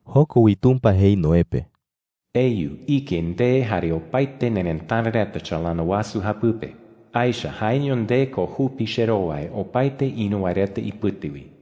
Joko wi Tumpa jei Noé pe: “Eyu ike nde jare opaete nerëtara reta chalana wasu japɨpe,” jei. “Aecha jaeño nde ko jupi cherowai opaete ïru wae reta ipɨte wi,” jei.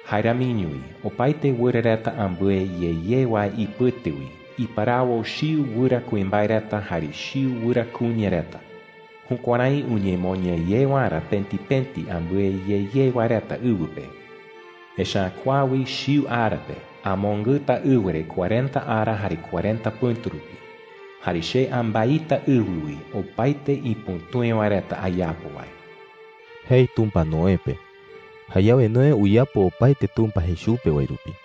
“Jae ramiño wi opaete wɨra reta ambɨe ye ye wae ipɨte wi iparawo chiu wɨra kuimbae reta jare chiu wɨra kuña reta, jukuärái uñemoña ye waerä pëti pëti ambɨe ye ye wae reta ɨwɨ pe. Echa’ä kua wi chiu ara pe amongɨta ɨwɨ re cuarenta ara jare cuarenta pɨ̈tu rupi. Jare che ambaita ɨwɨ wi opaete ipütúe wae reta ayapo wae,” jei Tumpa Noé pe. Jayawe Noé uyapo opaete Tumpa jei chupe wae rupi.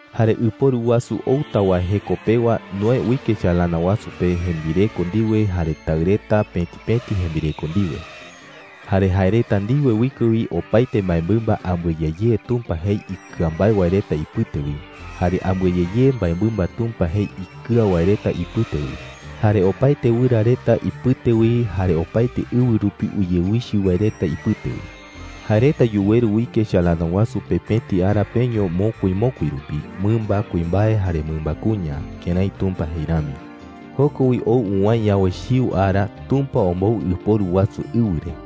Jare ɨporu wasu outa wae jeko pewa Noé uike chalana wasu pe jembireko ndiwe jare taɨ reta pëti pëti jembireko ndiwe. Jare jae reta ndiwe uike wi opaete mbaemɨmba ambɨe ye ye Tumpa jei ikɨa mbae wae reta ipɨte wi, jare ambɨe ye ye mbaemɨmba Tumpa jei ikɨa wae reta ipɨte wi, jare opaete wɨra reta ipɨte wi, jare opaete ɨwɨ rupi uyewichɨ wae reta ipɨte wi. Jae reta yuweru uike chalana wasu pe pëti ara peño mokui mokui rupi, mɨmba kuimbae jare mɨmba kuña, kërái Tumpa jei rami. Joko wi ou uwäe yawe chiu ara, Tumpa ombou ɨporu wasu ɨwɨ re.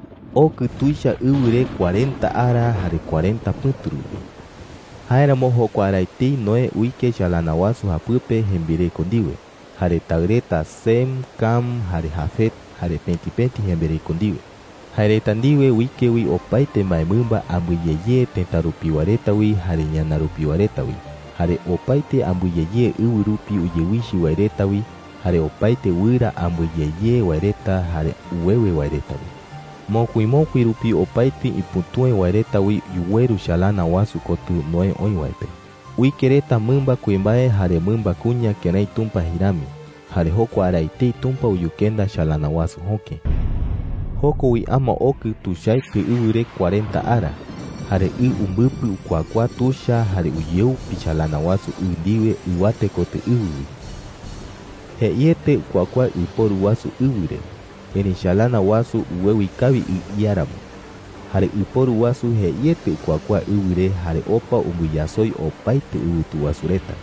Okɨ tuicha ɨwɨ re cuarenta ara jare cuarenta pɨ̈tu rupi. Jáeramo jokua ara etei Noé uike chalana wasu japɨpe jembireko ndiwe, jare taɨ reta Sem, Cam, jare Jafet, jare pëti pëti jembireko ndiwe. Jae reta ndiwe uike wi opaete mbaemɨmba ambɨe ye ye tëta rupiwa reta wi jare ñana rupiwa reta wi, jare opaete ambɨe ye ye ɨwɨ rupi uyewichɨ wae reta wi, jare opaete wɨra ambɨe ye ye wae reta jare uwewe wae reta wi. Mokui mokui rupi opaete ipütúe wae reta wi yuweru chalana wasu kotɨ Noé oï wae pe. Uike reta mɨmba kuimbae jare mɨmba kuña kërái Tumpa jei rami. Jare jokua ara etei Tumpa uyukenda chalana wasu jöke. Joko wi ama okɨ tuichaete ɨwɨ re cuarenta ara. Jare ɨ umbɨpɨ ukuakuaa tuicha jare uyeupi chalana wasu ɨ ndiwe ɨwate kotɨ ɨwɨ wi. Jeiete ukuakuaa ɨporu wasu ɨwɨ re, erëi chalana wasu uwewi kawi ɨ iáramo. Jare ɨporu wasu jeieteño ukuakuaa ɨwɨ re jare opa umbɨyasoi opaete ɨwɨtu wasu reta.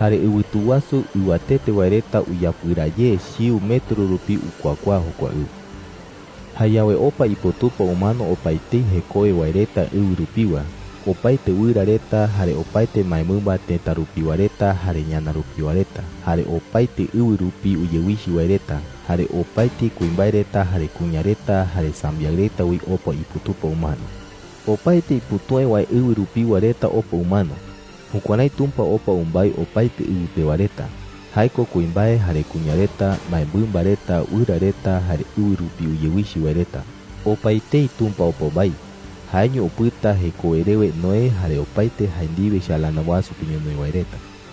Jare ɨwɨtu wasu ɨwatete wae reta uyapɨraa ye chiu metro rupi ukuakuaa jokua ɨ. Jayawe opa iputupa umano opaetei jekowe wae reta ɨwɨ rupiwa. Opaete wɨra reta, jare opaete mbaemɨmba tëta rupiwa reta jare ñana rupiwa reta, jare opaete ɨwɨ rupi uyewichɨ wae reta, jare opaete kuimbae reta jare kuña reta jare sambiaɨ reta wi opa iputupa umano. Opaete ipütúe wae ɨwɨ rupiwa reta opa umano. Jukuärái Tumpa opa umbái opaete ɨwɨ pewa reta – jae ko kuimbae jare kuña reta, mbaemɨmba reta, wɨra reta, jare ɨwɨ rupi uyewichɨ wae reta. Opaetei Tumpa opa umbái. Jaeño upɨta jekowe rewe Noé jare opaete jae ndiwe chalana wasu pe ñonoï wae reta.